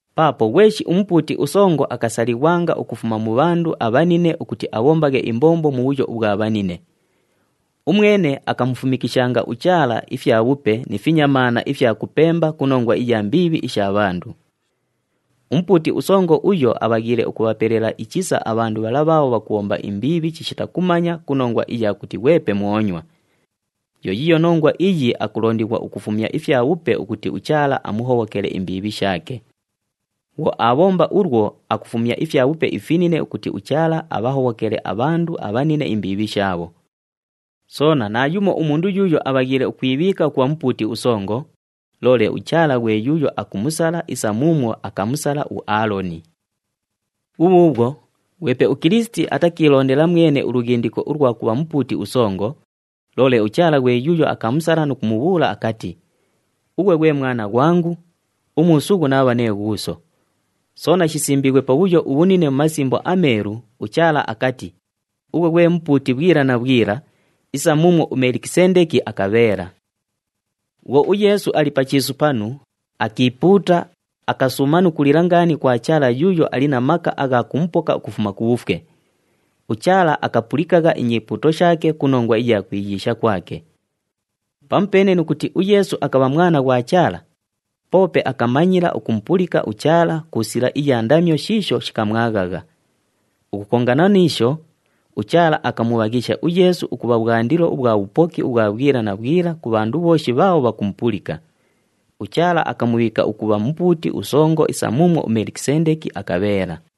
Paapo ghweshi umupuuti usongo akasalighwanga ukufuma mu bhandu abhanine ukuti abhombaghe imbombo mu bhuyo ubhwa bhanine. Umwene akamufumikishanga uChaala ifyabhupe ni finyamaana ifya kupemba ku nongwa iya mbiibhi isha bhandu. Umupuuti usongo uyo abhaghiile ukubhapelela ichisa abhandu bhala bhaabho bhakubhomba imbiibhi chishita kumanya ku nongwa iya kuti ghwepe mwonywa. Yo yiiyo nongwa iyi akulondighwa ukufumya ifyabhupe ukuti uChaala amuhobhokele imbiibhi shaake. Bhwo aabhomba ulwo, akufumya ifyabhupe ifinine ukuti uChaala abhahobhokele abhandu abhanine imbiibhi shaabho. Soona naayumo umundu yuuyo abhaghiile ukwibhiika ukubha umupuuti usongo, loole uChaala ghwe yuuyo akumusala isa muumwo akamusala uAaloni. Bhubhuubhwo, ghwepe uKilisiti atakiilondela mwene ulughindiko ulwa kubha Mupuuti uSongo, loole uChaala ghwe yuuyo akamusala nu kumubhuula akati, “Ughwe ghwe Mwana ghwangu, umuusughu naabha nee Ghuuso.” Soona shisimbiighwe pabhuyo ubhunine mu Masimbo aMeelu, uChaala akati, “Ughwe ghwe Mupuuti bhwila na bhwila isa muumwo uMelikisendeki akabheela.” Bhwo uYeesu ali pa chiisu panu, akiipuuta, akasuuma nu kulila ngaani kwa Chaala yuuyo ali na maka agha kumupoka ukufuma ku bhufwe. UChaala akapulikagha inyipuuto shaake ku nongwa iya kwiyiisha kwake. Pamupeene nu kuti uYeesu akabha Mwana ghwa Chaala, poope akamanyila ukumupulika uChaala ku sila iya ndamyo shiisho shikamwaghagha. Ukukongana ni isho, uChaala akamubhaghisha uYeesu ukubha bhwandilo ubhwa bhupoki ubhwa bhwila na bhwila ku bhandu bhooshi bhaabho bhakumupulika. UChaala akamubhiika ukubha Mupuuti uSongo isa muumwo uMelikisendeki akabheela.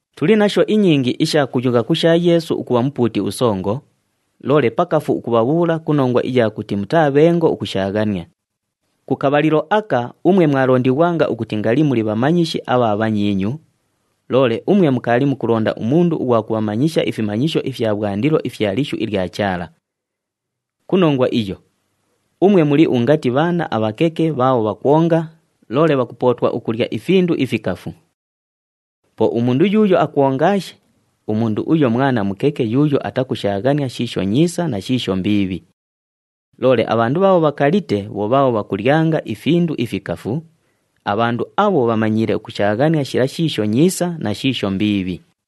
Tuli nasho inyingi isha kuyugha ku sha Yeesu ukubha Mupuuti uSongo, loole pakafu ukubhabhuula ku nongwa iya kuti mutaa bhengo ukushaaghania. Ku kabhalilo aka umwe mwalondighwanga ukuti ngali muli bhamanyishi abha bhanyiinyu, loole umwe mukaali mukulonda umundu ughwa kubhamanyisha ifimanyisho ifya bhwandilo ifya lishu ilya Chaala! Ku nongwa iyo, umwe muli ungati bhaana abhakeke bhaabho bhakwonga, loole bhakupootwa ukulya ifindu ifikafu. Po umundu yuuyo akwongaashe, umundu uyo mwana mukeke yuuyo atakushaaghania shiisho nyiisa na shiisho mbiibhi. Loole abhandu bhaabho bhakalite bho bhaabho bhakulyanga ifindu ifikafu, abhandu abho bhamanyiile ukushaaghania shila shiisho nyiisa na shiisho mbiibhi.